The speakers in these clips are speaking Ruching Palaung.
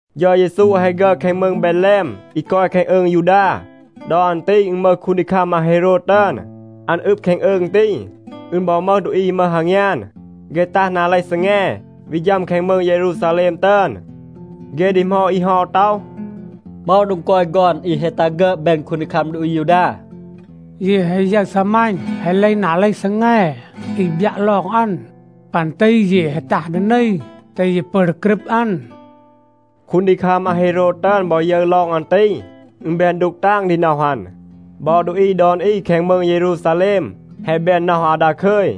เฌา เยซู แฮะ ฆึอด แคง มืง เบดแลม อี กอย แคง อืง ยูดา. ดอ อัน ตี อึณ มึห คูนดีคัม อาเฮโรด ตึอน. อัน อึบ แคง อืง ตี. อึณ บอ มึห ดูอี อี มึห อางยาน. เฆ ตัห นา เลห ซีแง, วี ฌัม แคง มืง เยรูซาแลม ตึอน. เฆ ดีหมอด อี เฮา ต็อห, “เหมา โดง กอย ฆอน อี แฮะ ตัห ฆึอด แบน คูนดีคัม ดูอี อายูดา? เย แฮะ ยึร ซีมัณ แฮะ เลห นา เลห ซีแง อี บยัะ ลอง อัน. ปัน ตี เย แฮะ ตัห ดี นี, แตห เย ปึอน ดี กรึบ อัน.” คูนดีคัม อาเฮโรด ตึอน บอ ยึร ลอง อัน ตี, อึณ แบน ดูก ตาง ดี น็อห อัน. บอ ดูอี ดอน อี แคง มืง เยรูซาแลม แฮะ แบน น็อห อาว ดาคึย.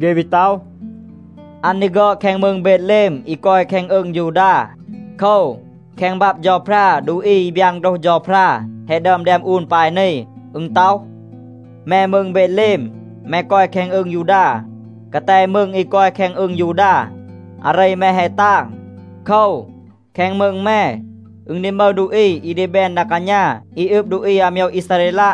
เฆ วี ต็อห, “อัน ดี ฆึอด แคง มืง เบดแลม, อี กอย แคง อืง ยูดา.” โคว, แคง บับ เฌาพรา ดูอี อี บยาน โฆรห เฌาพรา แฮะ ดึอม แดม อูน ปาย นี. อึณ ต็อห, “แม มืง เบดแลม, แม กอย แคง อืง ยูดา. กาแต มืง อี กอย แคง อืง ยูดา, อาเร แม แฮะ ตาง. โคว, แคง มืง แม อึณ ดี มึห ดูอี อี ดี แบน ดา กาณา อี อึบ ดูอี อาโมยว อีซาเรลัะ.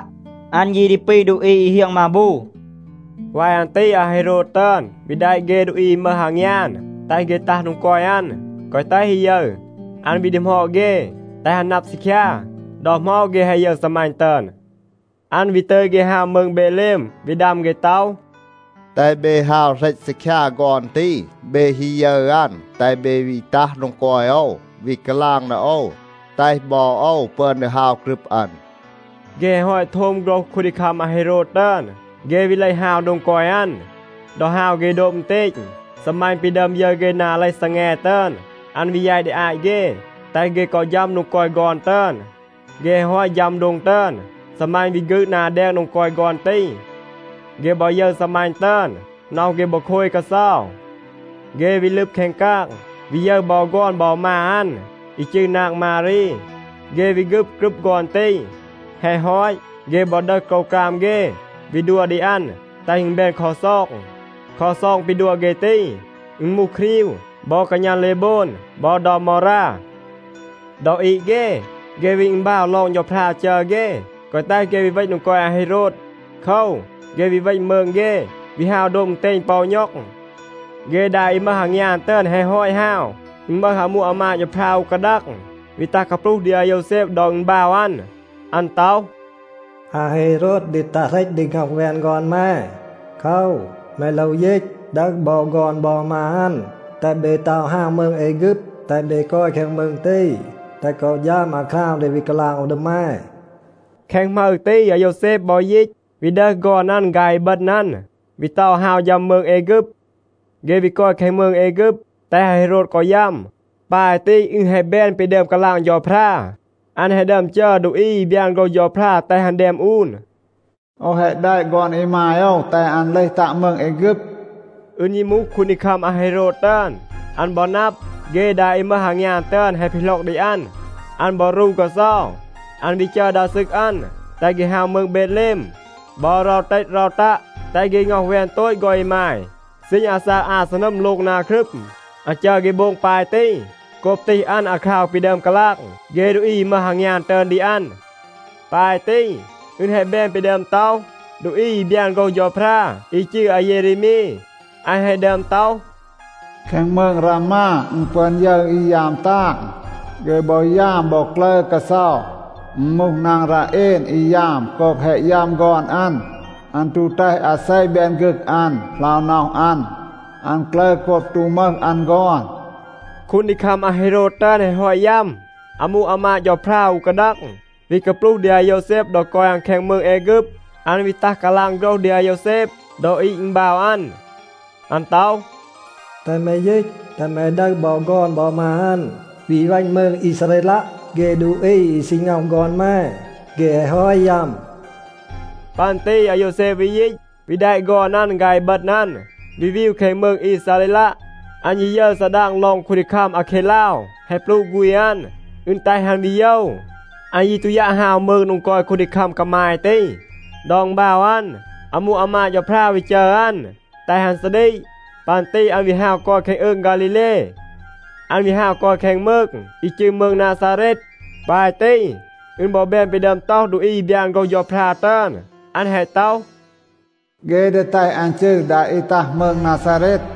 อัน ยี ดี ปี ดูอี อี เฮียง มาบู.” วาย อัน ตี อาเฮโรด ตึอน วี แดะ เฆ ดูอี อี มึห อางยาน, แตห เฆ ตัห โดง กอย อัน, แกวะ แตห อี ยึร. อัน วี ดีหมอด เฆ, แตห อัน นับ ซีคยา, ดอ เหมา เฆ แฮะ ยึร ซีมัณ ตึอน. อัน วี ตึย เฆ ฮาว มืง เบดแลม วี ดัม เฆ ต็อห, “แตห เบ ฮาว เหรต ซีคยา ฆอน ตี. เบ ฮี ยึร อัน, แตห เบ วี ตัห โดง กอย โอว, วี กาลาง ดี โอว, แตห บอ โอว ปึอน ดี ฮาว กรึบ อัน.” เฆ แฮะ ฮอต โทม โฆรห คูนดีคัม อาเฮโรด ตึอน, เฆ วี เลห ฮาว โดง กอย อัน. ดอ ฮาว เฆ โดบ อึณเตณ, ซีมัณ ปี ดึอม ยึร เฆ นา เลห ซีแง ตึอน, อัน วี แยต ดี อาต เฆ, แตห เฆ กอ ฌัม โดง กอย ฆอน ตึอน. เฆ แฮะ ฮอต ฌัม โดง ตึอน, ซีมัณ วี ฆืด นา แดง โดง กอย ฆอน ตี. เฆ บอ ยึร ซีมัณ ตึอน, น็อห เฆ บอ โคย กาเซา. เฆ วี ลึบ แคง กาง, วี ยึร บอ ฆอน บอ มา อัน, อี จืร นาง มารี. เฆ วี ฆึบ กรึบ ฆอน ตี. แฮะ ฮอต, เฆ บอ ดึห โกรวกราม เฆ, วี ดัว ดี อัน, แตห อึณ แบน ลักซอง. ลักซอง ปี ดัว เฆ ตี, อึณ มูห ครีว บอ กาณัน เลโบน บอ เดา มอรา. ดอ อีด เฆ, เฆ วี อึณบาว ลอง เฌาพรา จัร เฆ, แกวะ แตห เฆ วี เวณ โดง กอย อาเฮโรด. โคว, เฆ วี เวณ มืง เฆ, วี ฮาว โดบ อึณเตณ ปอ อู ณ็อง. เฆ ดา อี มึห อางยาน ตึอน แฮะ ฮอต ฮาว, อึณ มึห อามู อามาด เฌาพรา อู กาดัง วี ตัห กาปลูห ดี อาโยวแซบ ดอ อึณบาว อัน. อัน ต็อห, “อาเฮโรด ดี ตัห เหรต ดี ง็อห แวน ฆอน แม. โคว, แม โลว ยีต, ดึห บอ ฆอน บอ มา อัน, แตห เบ เตา ฮาว มืง แอฆึบ, แตห เบ กอย แคง มืง ตี, แตห กอ ฌัม อาคราว ดี วี กาลาง โอว ดี แม.” แคง หมึร ตี อาโยวแซบ บอ ยีต, วี ดึห ฆอน อัน ฆาย อีบึณ อัน, วี เตา ฮาว ฌัม มืง แอฆึบ. เฆ วี กอย แคง มืง แอฆึบ, แตห อาเฮโรด กอ ยัม. ปาย ตี อึณ แฮะ แบน ปี ดึอม กาลาง เฌาพรา. อัน แฮะ ดึอม จัร ดูอี อี บยาน โฆรห เฌาพรา แตห อัน แดม อูน, “โอว แฮะ แดะ ฆอน อีมาย โอว, แตห อัน เลห ตัะ มืง แอฆึบ.” อึณ ยี มูห คูนดีคัม อาเฮโรด ตึอน, อัน บอ นับ, เฆ ดา อี มึห อางยาน ตึอน แฮะ ปีหล็อก ดี อัน, อัน บอ รู กาเซา. อัน วี จัร ดา ซึก อัน, แตห เฆ ฮาว มืง เบดแลม บอ เรา เตต เรา ตัะ, แตห เฆ ง็อห แวน โตต ฆอน อีมาย ซีณ อาซาก อา ซีนัม โลง นา ครึม. อัน จัร เฆ โบง ปาย ตี โกบ ตีห อัน อาคราว ปี ดึอม กาลาง เฆ ดูอี อี มึห อางยาน ตึอน ดี อัน. ปาย ตี อึณ แฮะ แบน ปี ดึอม ต็อห ดูอี อี บยาน โฆรห เฌาพรา อี จืร อาเยเรมี. อัน แฮะ ดึอม ต็อห, “แคง มืง รามา อึณ ปึอน ยึร อี ยาม ตาง. เฆ บอ ยาม บอ กลึร กาเซา. อึณ มูห นาง ราเอน, อี ยาม โกบ แฮะ ยัม ฆอน อัน. อัน ตู แตห อาเซ แบน ฆึก อัน, เหลา น็อห อัน. อัน กลึร โกบ ตู มึห อัน ฆอน.” คูนดีคัม อาเฮโรด ตึอน แฮะ ฮอต ยัม, อามู อามาด เฌาพรา อู กาดัง วี กาปลูห ดี อาโยวแซบ ดอ กอย อัน แคง มืง แอฆึบ. อัน วี ตัห กาลาง โฆรห ดี อาโยวแซบ ดอ อีด อึณบาว อัน. อัน ต็อห, “แตห แม ยีต, แตห แม ดึห บอ ฆอน บอ มา อัน, วี เวณ มืง อีซาเรลัะ. เฆ ดูอี อี ซี ง็อห ฆอน แม, เฆ แฮะ ฮอต ยัม.” ปัน ตี อาโยวแซบ วี ยีต, วี แดะ ฆอน อัน ฆาย อีบึณ อัน, วี วีว แคง มืง อีซาเรลัะ. อัน ยี ยึร ซาดาง ลอง คูนดีคัม อาเคดลาว แฮะ ปลูะ ฆูณ อัน, อึณ แตห อัน วี โยว. อัน ยี ตู ยัะ ฮาว มืง โดง กอย คูนดีคัม กามาย ตี. ดอ อึณบาว อัน, อามู อามาด เฌาพรา วี จัร อัน, แตห อัน ซาดีก. ปัน ตี อัน วี ฮาว กอย แคง อืง ฆาลีเล. อัน วี ฮาว กอย แคง มืง อี จืร มืง นาซาเรต. ปาย ตี อึณ บอ แบน ปี ดึอม ต็อห ดูอี อี บยาน โฆรห เฌาพรา ตึอน. อัน แฮะ ต็อห, “เฆ ดี แตห อัน จืร ดา อี ตัห มืง นาซาเรต.”